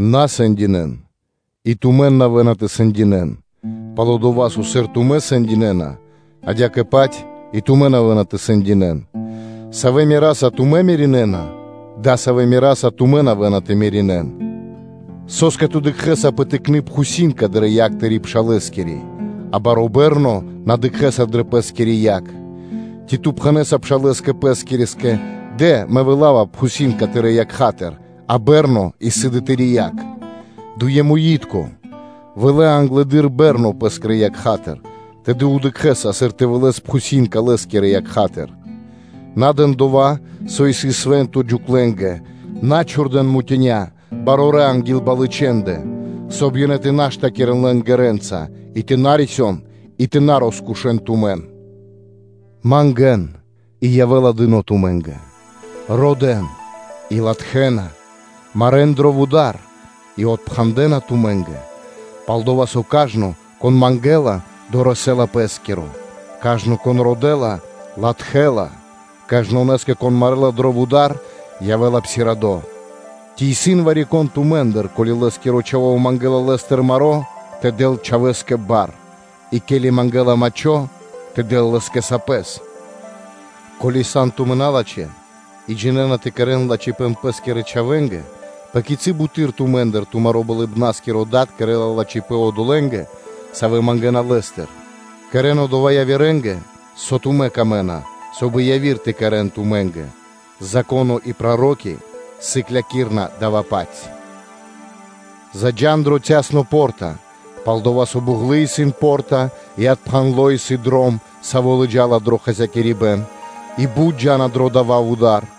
На сэндинэ́н, и тумэн на явэ́на тэ сэндинэ́н, пал-дова́ со, сыр тумэ́ сэндинэна, адя́кэ-паць и тумэн явэ́на тэ сэндинэ́н; савэ́ мераса тумэ́ меринэна, дасавэ́-паць мераса тумэн явэ́на тэ меринэн. Со́скэ ту дыкхэ́са пэ тыкны пхусинка дрэ якх тырэ́ пшалэскири, а баро́ бэрно на дыкхэ́са дрэ пэ́скири якх? Ци, сыр ту пхэнэ́са пшалэ́скэ пэскирэскэ; ‘дэ, мэ вылава пхусинка тырэ́ якхатыр; а бэрно исын дрэ тыри́ якх? Дуемуитко, вылэ англэды́р бэрно пэ́скирэ якхатыр, тэды дыкхэ́са, сыр тэ вылэс пхусинка тырэ́ пшалэ́скирэ якхатыр. На дэн дова́, со исын свэ́нто, джуклэнгэ, на чхурдэ́н мутиня (жэмчуги) анги́л балычэндэ, соб (кай) ёнэ тэ на штакирэн лэн ґэрэ́нца, и тэ на рисён, и тэ на роскушэн тумэн. Мангэ́н, и явэ́ла дыно́ тумэ́нгэ; родэ́н, и латхэ́на; марэ́н дро вуда́р, и псиравэна (отпхандэна) тумэ́нгэ. Пал-дова́ со кажно, кон мангэ́ла, дорэсэ́ла пэ́скиро; кажно, кон родэ́ла, латхэ́ла; кажнонэ́скэ, кон марэла дро вуда́р, явэ́ла псирадо (отпхандло). Ци исын вари-кон тумэ́ндыр, ко́ли лэ́скиро чхаво́ мангэ́ла лэ́стыр маро́, тэ дэл чхавэ́скэ бар? И ке́ли мангэ́ла мачхо, тэ дэл лэ́скэ сапэс? Ко́ли тумэ́ сан налачхэ́, и джинэ́на тэ кэрэ́н лачхипэ́н пэ́скирэ чхавэ́нгэ, пэ кицы́ буты́р тумэ́ндыр тумаро́ Болыбна́скиро Дад кэрэ́ла лачхипэ́н одолэ́нгэ, савэ́ мангэна Лэ́стыр. Кэрэ́н дова́ явирэ́нгэ, со тумэ́нгэ исын пир ило́, соб (кай) и яви́р тэ кэрэ́н тумэ́нгэ; Зако́но и проро́ки сыклякирэ́на дава́-паць. Заджа́н дро цясно (танго) по́рта, пал-дова́ со буґлы исын по́рта и отпхандло исын дром, саво́ лыджа́ла дро хасякирибэн, и бут джа́на дро дава́ вуда́р.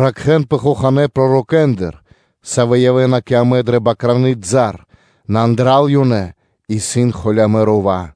Ракхэ́нпэ хоханэ́ пророкэндыр, савэ́ явэ́на кэ амэ дрэ бакраны и́дя, нэ андра́л ёнэ исын холямэ́ рува́;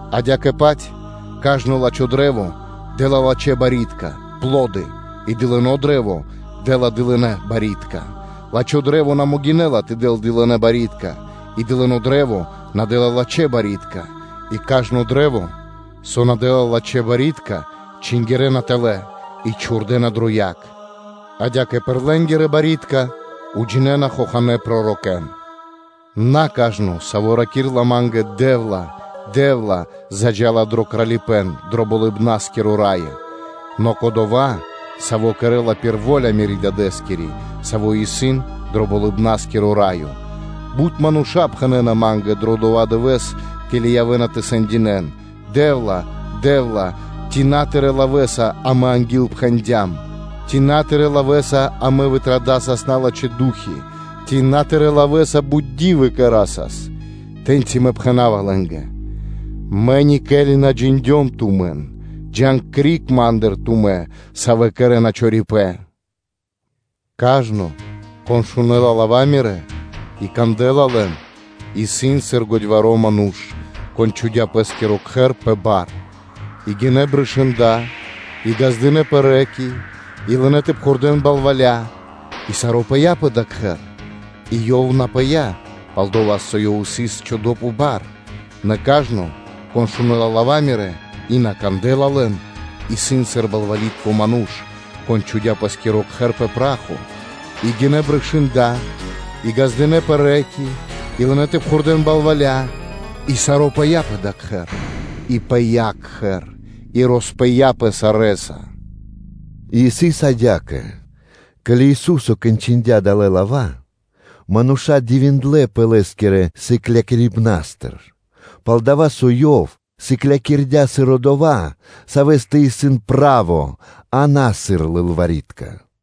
Адя́кэ-паць кажно лачхо́ кашт дэ́ла лачхэ́ барьякирдэ́ (пло́ды) и дылыно́ кашт дэ́ла дылынэ́ барьякирдэ́. Лачхо́ кашт на могинэ́ла тэ дэл дылынэ́ барьякирдэ́, и дылыно́ кашт на дэ́ла лачхэ́ барьякирдэ́. И кажно кашт, со на дэ́ла лачхэ́ барьякирдэ́, чингирэна тэлэ́ и чхурдэна дрэ яг. Адя́кэ пир лэ́нгирэ барьякирдэ́ тумэ́ ґалёна хоханэ́ пророкэ́н. На кажно, саво́ ракирэ́ла Ма́нгэ: ‘Дэ́вла, Дэ́вла!’ – заджа́ла дро Кралипэ́н дро Болыбна́скиро Раё; нэ кодова́, саво́ кэрэ́ла пир во́ля Мирэ́ Дадэ́скири, Саво́ исын дро Болыбна́скиро Раё. Бут мануша́ пхэнэ́на Ма́нгэ дро дова́ дывэ́с, ке́ли явэ́на тэ сэндинэ́н: ‘Дэ́вла, Дэ́вла! Ци на Тырэ́ лавэ́са амэ ангилпхэндям? Ци на Тырэ́ лавэ́са амэ вытрадасас налачхэ́ ду́хи? Ци на Тырэ́ лавэ́са бут ди́вы кэрасас?’ Тэ́ньци Мэ пхэна́ва лэ́нгэ: ‘Мэ никели на джиндём тумэн; джа́н криг Ма́ндыр тумэ́, савэ́ кэрэ́на чорипэ́н.’ Кажно, кон шунэ́ла лава́ Мирэ́ и кандэ́ла лэн, исын сыр годьваро́ ману́ш, кон чхудя́ пэ́скиро кхэр пэ бар. И гинэ́ брышында, и ґаздынэ́пэ рэ́ки (лэня́), и лынэ́ тэ пхурдэ́н балваля, и саро́ пыя́ пэ дава́ кхэр; и ёв на пыя́, пал-дова́ со сыс чхудо́ пэ бар. Нэ кажно, кон шунэ́ла лава́ Мирэ́, и на кандэ́ла лэн, исын сыр балвалитко ману́ш, кон чхудя́ пэ́скиро кхэр пэ пра́хо; и гинэ́ брышында, и ґаздынэ́пэ рэ́ки (лэня́), и лынэ́ тэ пхурдэ́н балваля, и саро́ пыя́ пэ дава́ кхэр. И пыя́ кхэр, и роспыяпэ сарэ́са.’” И сыс адя́кэ: ке́ли Ису́со кончындя далэ́ лава́, мануша́ дивиндлэ́пэ Лэ́скирэ сыклякирибнастыр, пал-дова́ со Ёв сыклякирдя́, сыр Одова́, Савэ́стэ исын право, а на сыр лылвари́тка (кни́жники).